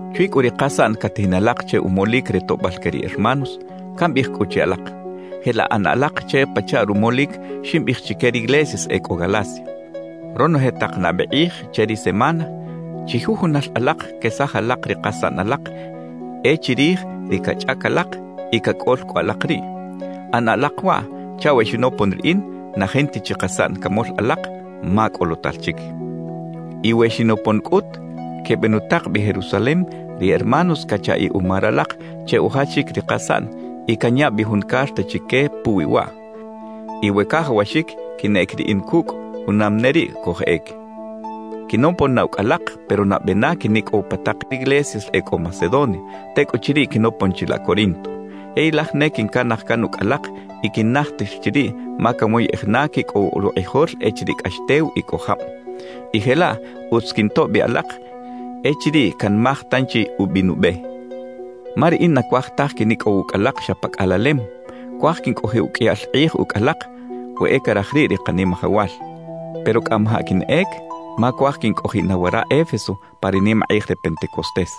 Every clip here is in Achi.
Chwi cꞌu ri kasaꞌn catajin alak che umolic re toꞌbal que ri hermanos, cambiꞌij cꞌu che alak: Jelaꞌ ꞌana alak che pachaꞌ rumolic ximbiꞌij chique riglesias e cꞌo Galacia. Ronoje tak nabe kꞌij che ri semana, chijujunal alak quesaj alak ri kasaꞌn alak e chirij ri cachꞌac alak y cacꞌol cꞌu alak riꞌ. ꞌAna alak waꞌ chaꞌ we xinopon riꞌin, na jinta chi kasaꞌn camol alak, ma cꞌolotal chic. Y we xinopon cꞌut, quebenutak bi Jerusalem ri hermanos cachaꞌiꞌ uma ralak che ujachic ri kasaꞌn y canya bi jun carta chique puwi waꞌ. Y we cajawaxic quinꞌec riꞌin cucꞌ, junam ne riꞌ cojꞌec. Quinopon na ucꞌ alak, pero nabe na quinicꞌow pa tak riglesias e cꞌo Macedonia; tecꞌuchiriꞌ quinopon chilaꞌ Corinto. Yey laj ne quincanaj can ucꞌ alak y quinnajtir chiriꞌ ma canwoyꞌej na quicꞌow rukꞌijol echiriꞌ cꞌax tew y cꞌo jab, y jelaꞌ utz quintoꞌ bi alak echiriꞌ canmaj tanchi ubi nube. Ma riꞌin na cuaj taj quinicꞌow ucꞌ alak xa pa cꞌalalem; cuaj quincꞌojiꞌ uqꞌuiyal kꞌij ucꞌ alak, we e caraj riꞌ ri Kanimajawal. Pero cꞌamajaꞌ quinꞌec ma cuaj quincꞌojiꞌ na wara Éfeso pa ri nimakꞌij re Pentecostés.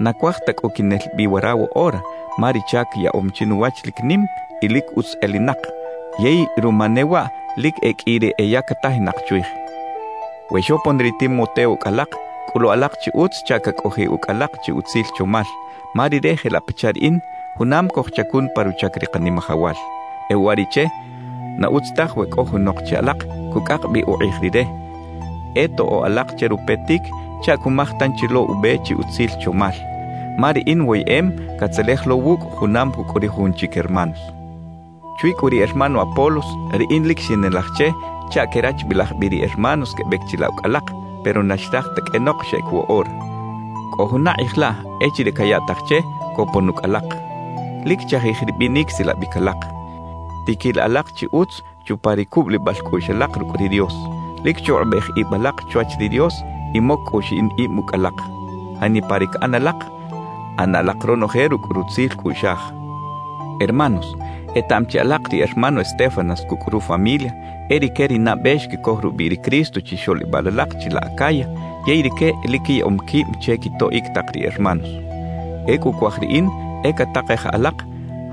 Na cuaj ta cꞌu quinel bi wara woꞌora, ma ri chac yaꞌom chinuwach lic nim y lic utz elinak, yey ruma ne waꞌ lic e qꞌui ri eyactajinak chwij. We xopon ri Timoteo ucꞌ alak, cꞌulu alak chi utz chaꞌ cacꞌojiꞌ ucꞌ alak chi utzil chomal; ma rire jelaꞌ pachaꞌ riꞌin, junam cojchacun pa ruchac ri Kanimajawal. E uwariꞌche, na utz taj we cꞌo junok che alak cucꞌak bi ukꞌij rire; e toꞌo alak che rupetic chaꞌ cumaj tanchi lo ube chi utzil chomal, ma riꞌin woyeꞌem catzelej lo wucꞌ junam cucꞌ ri jujun chic hermanos. Chwi cꞌu ri hermano Apolos, riꞌin lic xinelaj che chaꞌ querachbilaj bi ri hermanos quebec chilaꞌ ucꞌ alak, pero na xraj ta qꞌuenok xeꞌec woꞌora. Cꞌo juna kꞌij laꞌ echiriꞌ cayaꞌtaj che copon ucꞌ alak. Lic chajij ri binic silabic alak, tiquila alak chi utz chupa ri cubulibal cꞌuꞌx alak rucꞌ ri Dios, lic chukꞌubej ib alak chwach ri Dios y moc cꞌu xiꞌin ib ucꞌ alak. Janipa ri caꞌan alak, ꞌana alak ronoje rucꞌ rutzil cꞌuꞌxaj. Hermanos, etaꞌam chi alak ri hermano Estéfanas cucꞌ rufamilia e rique ri nabe xquicoj rubiꞌ ri Cristo chixoꞌlibal alak chilaꞌ Acaya, yey rique lic quiyaꞌom quib che quitoꞌic tak ri hermanos. Ecꞌu cuaj riꞌin e catakej alak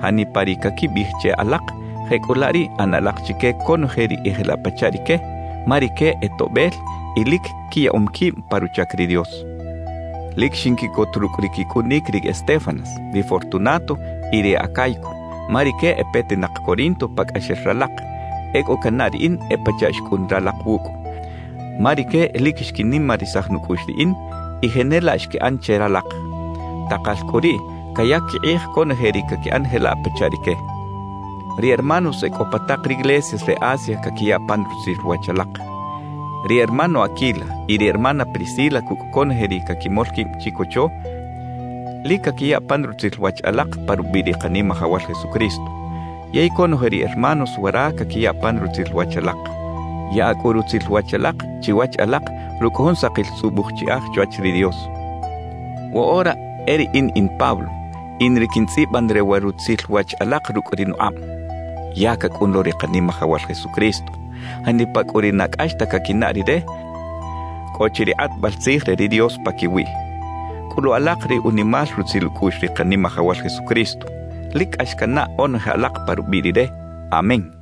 janipa ri caquibiꞌij che alak; jecꞌulaꞌ riꞌ ꞌana alak chique conoje ri e jelaꞌ pachaꞌ rique, ma rique e toꞌbel y lic quiyaꞌom quib pa ruchac ri Dios. Lic xinquiꞌcot rucꞌ ri quicꞌunic ri Estéfanas, ri Fortunato y ri Acaico, ma rique e petinak Corinto pacꞌaxel ralak; ecꞌu cannaꞌ riꞌin e pachaꞌ xcꞌun ralak wucꞌ. Ma rique lic xquinimarisaj nucꞌuꞌx riꞌin y jenelaꞌ xquiꞌan che ralak. Takal cꞌu riꞌ cayac quikꞌij conoje ri caquiꞌan jelaꞌ pachaꞌ rique. Ri hermanos e cꞌo pa tak riglesias re Asia caquiya pan rutzil wach alak. Ri hermano Aquila y ri hermana Priscila cucꞌ conoje ri caquimol quib chicocho, lic caquiya pan rutzil wach alak pa rubiꞌ ri Kanimajawal Jesucristo. Yey conoje ri hermanos wara caquiya pan rutzil wach alak. Yaꞌa cꞌu rutzil wach alak chiwach alak rucꞌ jun sakil tzꞌubuj chiꞌaj chwach ri Dios. Woꞌora e riꞌin in Pablo, in ri quintzꞌiban re wa rutzil wach alak rucꞌ ri nukꞌab. ¡Ya cacꞌun lo ri Kanimajawal Jesucristo! Janipa cꞌu ri na cꞌax ta caquinaꞌ Rire, cꞌo chi ri kꞌatbal tzij re ri Dios paquiwiꞌ. Cꞌulu alak ri unimal rutzil ucꞌuꞌx ri Kanimajawal Jesucristo. Lic cꞌax cannaꞌ onoje alak pa rubiꞌ Rire. Amén.